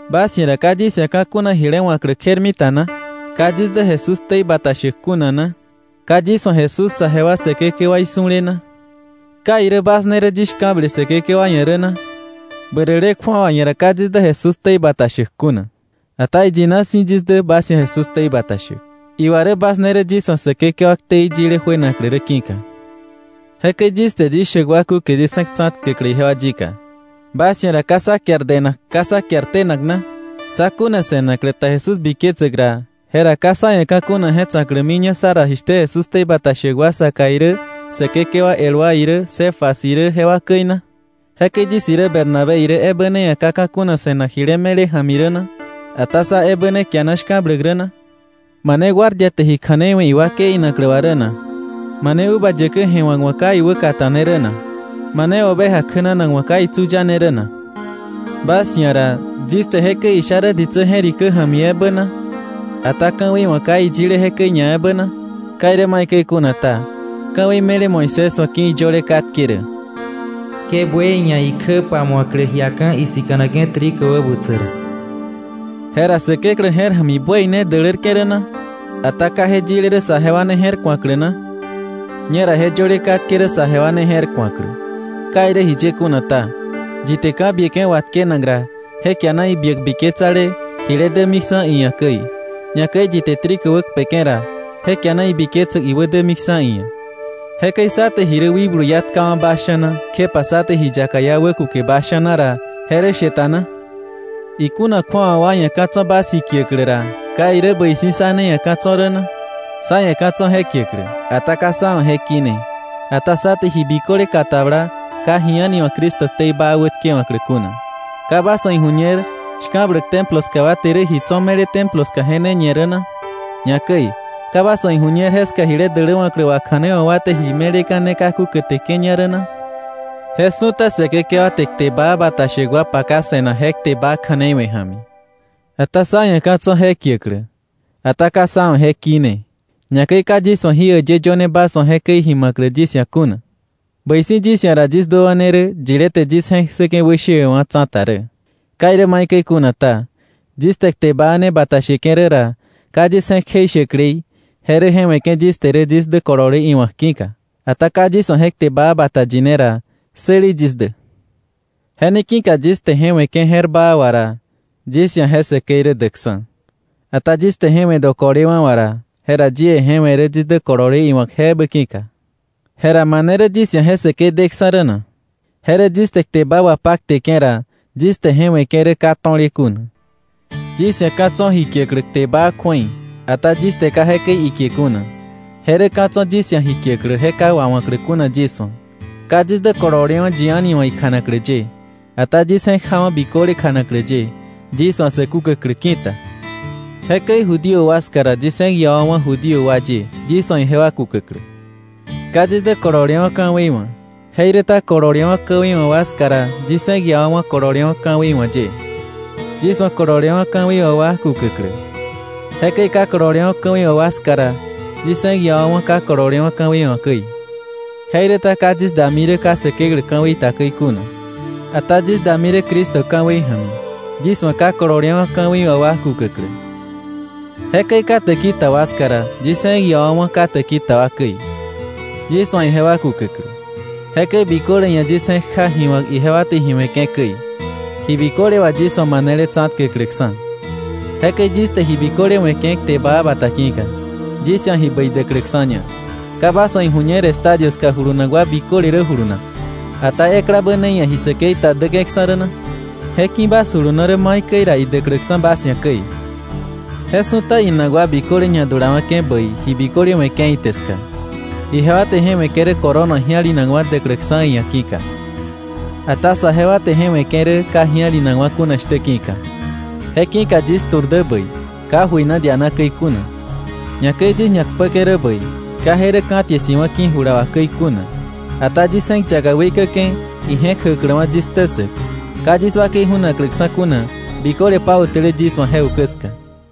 ¿Bas ia̱ ra ka yis ia̱ ka̱ kuna jile wa̱klä kjermita na? ¿Ka yis dä Jesús ktei bata shäk kuna na? ¿Ka yis wa̱ Jesús saje wa Säkekewaí su̱le na? ¿Ka irä bas ne rä yis shka̱ble Säkekewa ia̱ rä na? Bäräle kju̱awa ia̱ ra ka yis dä Jesús ktei bata shäk kuna. Ata iyina si̱ yis dä bas ia̱ Jesús ktei bata shäk. Iwa rä bas ne rä yis wa̱ Säkekewa ktei yile juenaklä rä ki̱ka. Jekäi yis te yis shäk wa kúke yis je̱k tsa̱tkäklä ijewa yika: Bas ia̱ ra ¿ka sá kiar denak, ka sá kiar tenak na? Sá kuna se̱naklä ta Jesús biketsäk ra, jera ¿ka sá ia̱ ka̱ kuna je tsa̱klämiña sá ra jishtä Jesús ktei bata shäk wa saka irä Säkekewa el wa irä Cefas irä jewa käi na? ¿Jekäi yis irä Bernabé irä ebä ne ia̱ ka ka̱ kuna se̱nak jile me̱le ja̱mi rä na? ¿Ata sá ebä kiana shka̱bläk rä na? ¿Mane guardia te ji kja̱nei we̱ iwakei inaklä wà rä na? ¿Mane uva yäkä je̱wa̱k wa̱ ka iwä kata̱ne rä na? ¿Mane oveja kjänanak wa̱ ka itsu yane rä na? Bas ia̱ ra, ¿yis te jekäi isha rä ditsä je̱rikä ja̱mi ebä na? Ata ¿Ka̱wei wa̱ ka iyile jekäi ñaebä na? Ka irä maikäi kuna ta, ka̱wei me̱le Moisés wa̱ ki̱ iyöle katke rä: “Ke buey ia̱ ikjä pamu̱aklä jiaka̱ isika̱nake̱ trigo wäbutsäk ra.” ¿Jera Säkeklä je̱r ja̱mi buey ne dälärke̱ rä na? Ata ¿ka je yile rä saje wa ne je̱rku̱aklä na? Ñera je yöle katke rä saje wa ne je̱rku̱aklä. Ka irä jiye kuna ta, yi te ka̱ bieke̱ watkenak ra, je kiana ibiäk biketsale jile dämiksa̱ iia̱ käi. Ñakäi yi te trigo wäkpeke̱ ra, je kiana ibiketsäk iwä dämiksa̱ iia̱. Jekäi sá te ji rä wikblu iá tkawa̱ bas sha̱na kjepa sá te ji yaka iá wä kuke bas sha̱na ra, ¿je rä she ta na? Ikuna kju̱awa wa ia̱ ka̱ tso̱ bas ji kiäklä ra, ¿ka irä bäi si̱ sá ne ia̱ ka̱ tso̱ rä na? Sá ia̱ ka̱ tso̱ je kiäklä, ata ka sá wa̱ je kine, ata sá te ji biköle katabla ka ji a̱ni wa̱ Cristo ktei baa wätkewa̱klä kuna. ¿Ka bas wa̱ iju̱ñer shka̱bläk Templo ska wa te rä ji tso̱ me̱le Templo ska je ne ñe rä na? Ñakäi ¿ka bas wa̱ iju̱ñer jeska jile däläwa̱klä wakja̱neiwa̱k wa te ji me̱leka̱ ne kaku käteke̱ña rä na? Je su̱ta Säkekewa te kte baa bata shäk wa paka se̱nak je kte baa kja̱nei we̱ ja̱mi. Ata sá ia̱ ka̱ tso̱ je kiäklä, ata ka sá wa̱ je kine. Ñakäi ka yis wa̱ jí äyë yöne bas wa̱ jekäi ji ma̱klä yis ia̱ kuna. ¡Bäi si̱ yis ia̱ ra yis duäwa̱ ne rä, yilé te yis je̱k ssäke̱ wäshewe̱wa̱ tsa̱ta rä! Ka irä maikäi kuna ta, yis te kte baa ne bata sheke̱ rä ra, ka yis je̱k kjeishäklei, je rä je we̱ke̱ yis te rä yis dä kolole iwa̱k ki̱ka. Ata ka yis wa̱ je kte baa bata yine ra, ¡säli yis dä! Je ne ki̱ka yis te je we̱ke̱ je̱r baa wà ra, yis ia̱ je säkei rä däkksa̱. Ata yis te je we̱ dokolewa̱ wà ra, jera yie je we̱ rä yis dä kolole iwa̱k je ebä ki̱ka. Jera ¿mane rä yis ia̱ je säkei deksa̱ rä na? Je rä yis te kte baa wapakteke̱ ra, yis te je we̱ke̱ rä ka to̱le kuna. Yis ia̱ ka̱ tso̱ ji kiäklä kte baa kju̱ei, ata yis te ka jekäi ikie kuna, je rä ka̱ tso̱ yis ia̱ ji kiäklä je ka wawa̱klä kuna yis wa̱. Ka yis dä kololewa̱ yi a̱ni wa̱ ikjanaklä ye, ata yis je̱k jawa̱ biköle kjanaklä ye, yis wa̱ sä kukäklä ki̱ta. Jekäi Judío wa ska ra, yis je̱k iawa̱wa̱ Judío ye yis wa̱ ijewa kukäklä. Ka yis dä kololewa̱ ka̱wei wa̱, jeiräta kololewa̱ ka̱wei wa̱ wa ska ra, yis je̱k iawa̱wa̱ kololewa̱ ka̱wei wa̱ ye, yis wa̱ kololewa̱ ka̱wei wa̱ wa kukäklä. Jekäi ka kololewa̱ ka̱wei wa̱ wa ska ra, yis je̱k iawa̱wa̱ ka kololewa̱ ka̱wei wa̱ käi. Jeiräta ka yis dami rä ka Säkeklä ka̱wei ta käi kuna, ata yis dami rä Cristo ka̱wei ja̱mi, yis wa̱ ka kololewa̱ ka̱wei wa̱ wa kukäklä. Jekäi ka täki ta wa ska ra, yis je̱k iawa̱wa̱ ka täki ta wa käi, yis wa̱ ijewa kukäklä. Jekäi biköle ia̱ yis je̱kja ji wa̱k ijewa te ji we̱ke̱ käi, ji biköle wà yis wa̱ manele tsa̱tkäkläkksa̱. Jekäi yis te je biköle we̱ke̱ kte baa bata ki̱ka, yis ia̱ ji bäi däkläksa̱ña. ¿Ka bas wa̱ iju̱ñer estadio ska julunak wa biköle rä julunak, ata eklabä ne ia̱ ji säkei ta däke̱ksa̱ rä na? Je ki̱ bas juluno rä maikäi ra idäkläksa̱ bas ia̱ käi. Je su̱ta inak wa biköle ñadulawa̱ke̱ bäi ji biköle we̱ke̱ ite ska. Ijewa te je we̱ke̱ rä corona ji̱alinakwa̱ däkläksa̱ iia̱ ki̱ka. Ata saje wa te je we̱ke̱ rä ka ji̱alinakwa̱ kuna shtä ki̱ka. Je ki̱ka yis tu̱r dä bäi, ka jöina diana käi kuna. Ñakäi yis ñakpäke̱ rä bäi, ka je rä ka̱ tie si̱wa̱ ki̱ jula wà käi kuna. Ata yis je̱k yaka weikäke̱ ije̱k jäkläwa̱ yis ktä ssäk, ka yis wakei ju̱nakläksa̱ kuna biköle pautäle yis wa̱ je ukä ska.